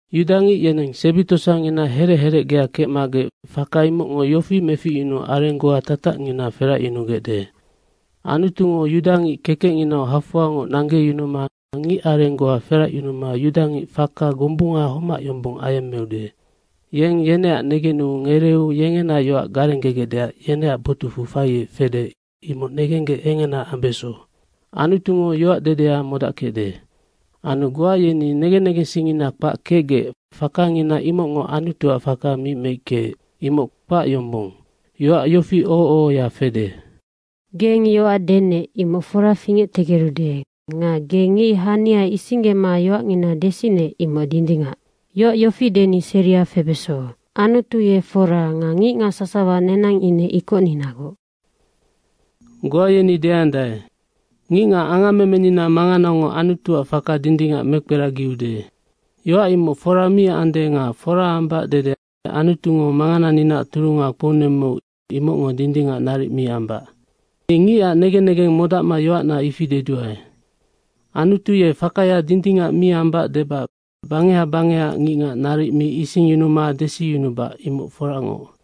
Yudangic yeneng sebi tosangina herec herecgea kecmagec faka imocngo yofi meficyunuu areng goa tatacngina feracyunugecde. Anutungo yudangic kekecnginau hafoangoc nanggeyunuma ngic areng goa feracyunuma yudangic faka gombunga homac yombong ayemmeude. Yeng yeneac negenu ngereeu yengena yoac garengegecdeac yeneac botucfu faiec fede, imoc negenggec engena ambeso. Anutungo yoac dedea modackecde. Anu goa yeni negen negensingngina kpac kecgec, fakangina imocngo Anutuac faka mi meickeec. Imoc kpac yombong. Yoac yofi oho ohoya fede, “Geng yoac denec, imoc fora fingectegerude nga ge ngic hania isinggema yoacngina desinec, imoc dindingac.” Yoac yofi deni seria febeso, “Anutu ye fora nga ngicngac sasawa nenang ine ikocninagoc.” Goa yeni deandae, “Ngicngac angammemenina manganangonoc Anutuac faka dindingac mekperagiude.” Yoac imoc fora mi ande nga fora ambac dede Anutungo mangananinaac turunga kpounemmeu, imocngo dindingac naric mi ambac. Ni ngicac negen negeng modacma yoacna ifi deduae. Anutu ye fakaya dindingac mi ambac debac bangeha bangehaac ngicngac naric mi isingyunuma desiyunubac, imoc foracngoc.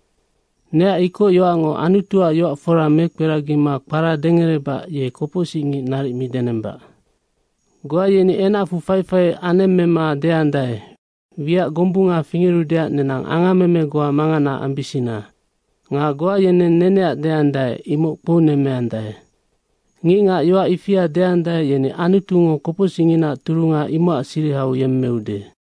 Neac ikocyoacngo Anutuac yoac fora mekperagima kpara dengerebac ye kopocsicngic naric mi denembac. Goa yeni enacfu faifai anemmema deandae, “Wiac gombunga fingerudeac nenang angammeme goa mangana ambisina.” Nga goa yeneng neneac deandae, “Imocnoc kpounemmeandae.” Ngicngac yoac ifia deandae, yeni Anutungo kopocsicnginaac turunga, imocac sirihau yemmeude.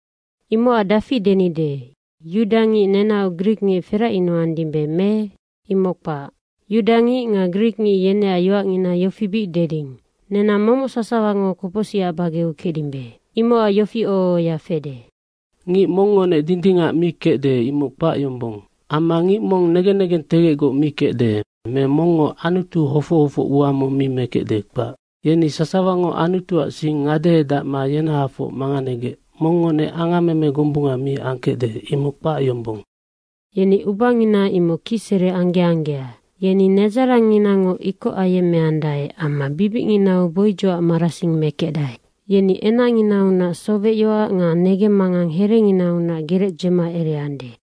Imocac dafi denide, yudangic nenaoc grikngic feracyunukecdimbe me? Imoc kpac. Yudangic nga grikngic yeneac yoacngina yofi bic deding, “Nenang momoc sasawango kopocsicac bageau kecdimbe.” Imocac yofi oho ohoya fede, “Ngic mongngonec dindingac mi kecde, imoc kpac yombong. Amma ngic mong negen negentegecgoc mi kecde me mongngo Anutu hofoc hofoc ua mong mi mekecde, kpac. Yeni sasawango Anutuac sing ngadehedacma yenahafoc manganegec, mongngonec angammeme gombunga mi angkecde, imoc kpac yombong.” “Yeni ubangina imoc kicsere angge anggea.” “Yeni nedzarangnginango ikoc ayemmeandae amma bibicnginau boidzocac marasing mekecdae.” “Yeni enacnginau sowecyoac nga negemmangang herenginaunac gerec dzema ereande.”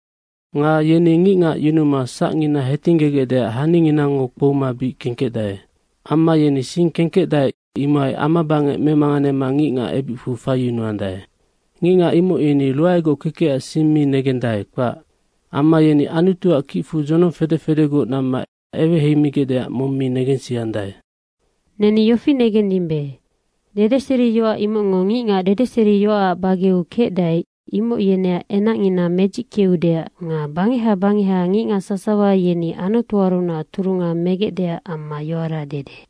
Nga yeni ngicngac yunuma sacngina hetinggegecdeac haninginango kpouma bic kengkecdae. Amma yeni sing kengkecdae, imohai amabangec memanganema ngicngac ebicfu faiyunuandae. “Ngicngac imoc yeni ruaegoc kekecac sing mi negendae, kpac.” Amma yeni Anutuac kicfu dzonong fede fedegoc namma eweheimigecdeac mong mi negensiandae. Neni yofi negendimbe, dedeseriyoac imocngo ngicngac dedeseriyoacac bageau kecdae, imoc yeneac enacngina medzickeudeac nga bangeha bangeha ngicngac sasawa yeni Anutuarunac turunga megecdeac amma yoara dede.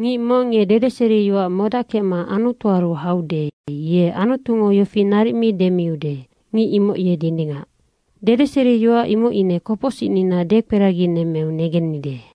Ngic mong ye dedeseriyoac modackecma Anutuaru haude, ye Anutungo yofi naric mi demiude, “Ngic imoc ye dindingac.” Dedeseriyoac imoc ine kopocsicnina dekperaginemmeu negennide.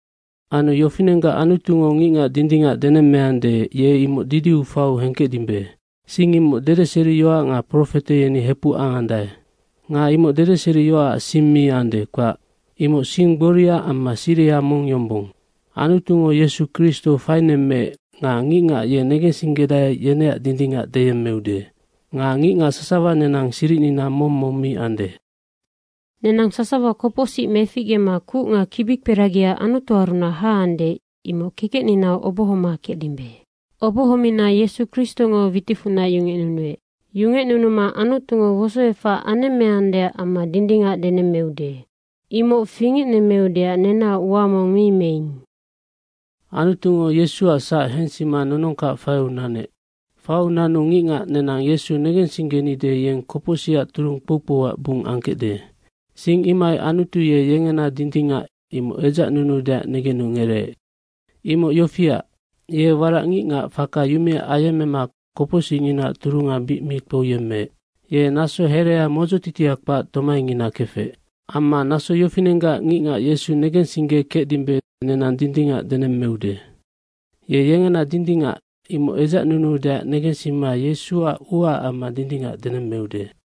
Anu yofinenggac Anutungo ngicngac dindingac denemmeande, ye imoc didiu faiu hengkecdimbe. Sing imoc dedeseriyoac nga profete yeni hepuc angandae nga imoc dedeseriyoacac sing mi ande, kpac. Imoc sing gboria amma siriha mong yombong. Anutungo Yesu Kristo fainemmeec nga ngicngac ye negensinggedae, yeneac dindingac deyemmeude. Nga ngicngac sasawa nenang siricnina mong mong mi ande, nenang sasawa kopocsic meficgema kuc nga kibikperagia Anutuarunac haande, imoc kekecninau obohoma kecdimbe. Obohomina Yesu Kristongo witicfunac yungecnunuec. Yungecnunuma Anutungo wosoefac anemmeandeac amma dindingac denemmeude. Imoc fingecnemmeudeac nenaoc ua mong mi meing. Anutungo Yesuac sac hensima nonongkac faiu nanu ngicngac nenang Yesu negensinggenide, yeng kopocsicac turung kpou kpouac bung angkecde. Sing imohai Anutu ye yengena dindingac, imoc edzacnunuudeac negenu ngereec. Imoc yofiac, ye warac ngicngac faka yumea ayemmema kopocsicnginaac turunga bic mi kpouyemmema naso herea modzotitia kpac tomaingina kefec. Ye naso yofinenggac ngicngac Yesu negensinggekecdimbe, nenang dindingac denemmeude. Ye yengena dindingac, imoc edzacnunuudeac negensima Yesuac uaac amma dindingac denemmeude.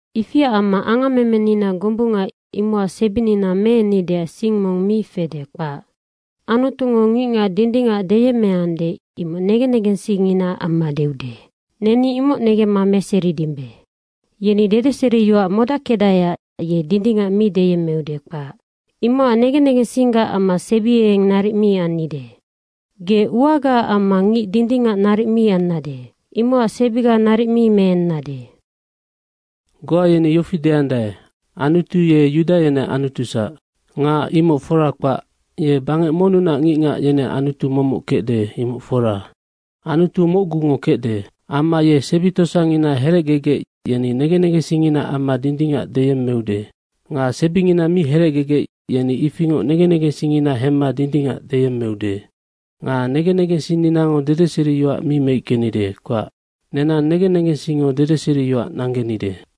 Ifiac amma angammemenina gombunga imocac sebinina meennideac sing mong mi fede, kpac. Anutungo ngicngac dindingac deyemmeande, imoc negen negensingnginaac amma deude, neni imoc negemma meseridimbe. Yeni dedeseriyoac modackecdaeac ye dindingac mi deyemmeude, kpac. Imocac negen negensinggac amma sebiengeng naric mi annide. Ge uagaac amma ngic dindingac naric mi annade, imocac sebiga naric mi meennade. Goa yeni yofi deandae, Anutu ye Yuda yeneac Anutusac. Nga imoc fora kpac, ye bangec monnunac ngicngac, yeneac Anutu momoc kecde, imoc fora. Anutu mocgungonoc kecde. Amma ye sebi tosangina herecgegec, yeni negen negensingnginaac amma dindingac deyemmeude. Nga sebingina mi herecgegec, yeni ifingoc negen negensingngina hemma dindingac deyemmeude. Nga negen negensinninango dedeseriyoac mi meickenide, kpac. Nenang negen negensingngo dedeseriyoac nanggenide.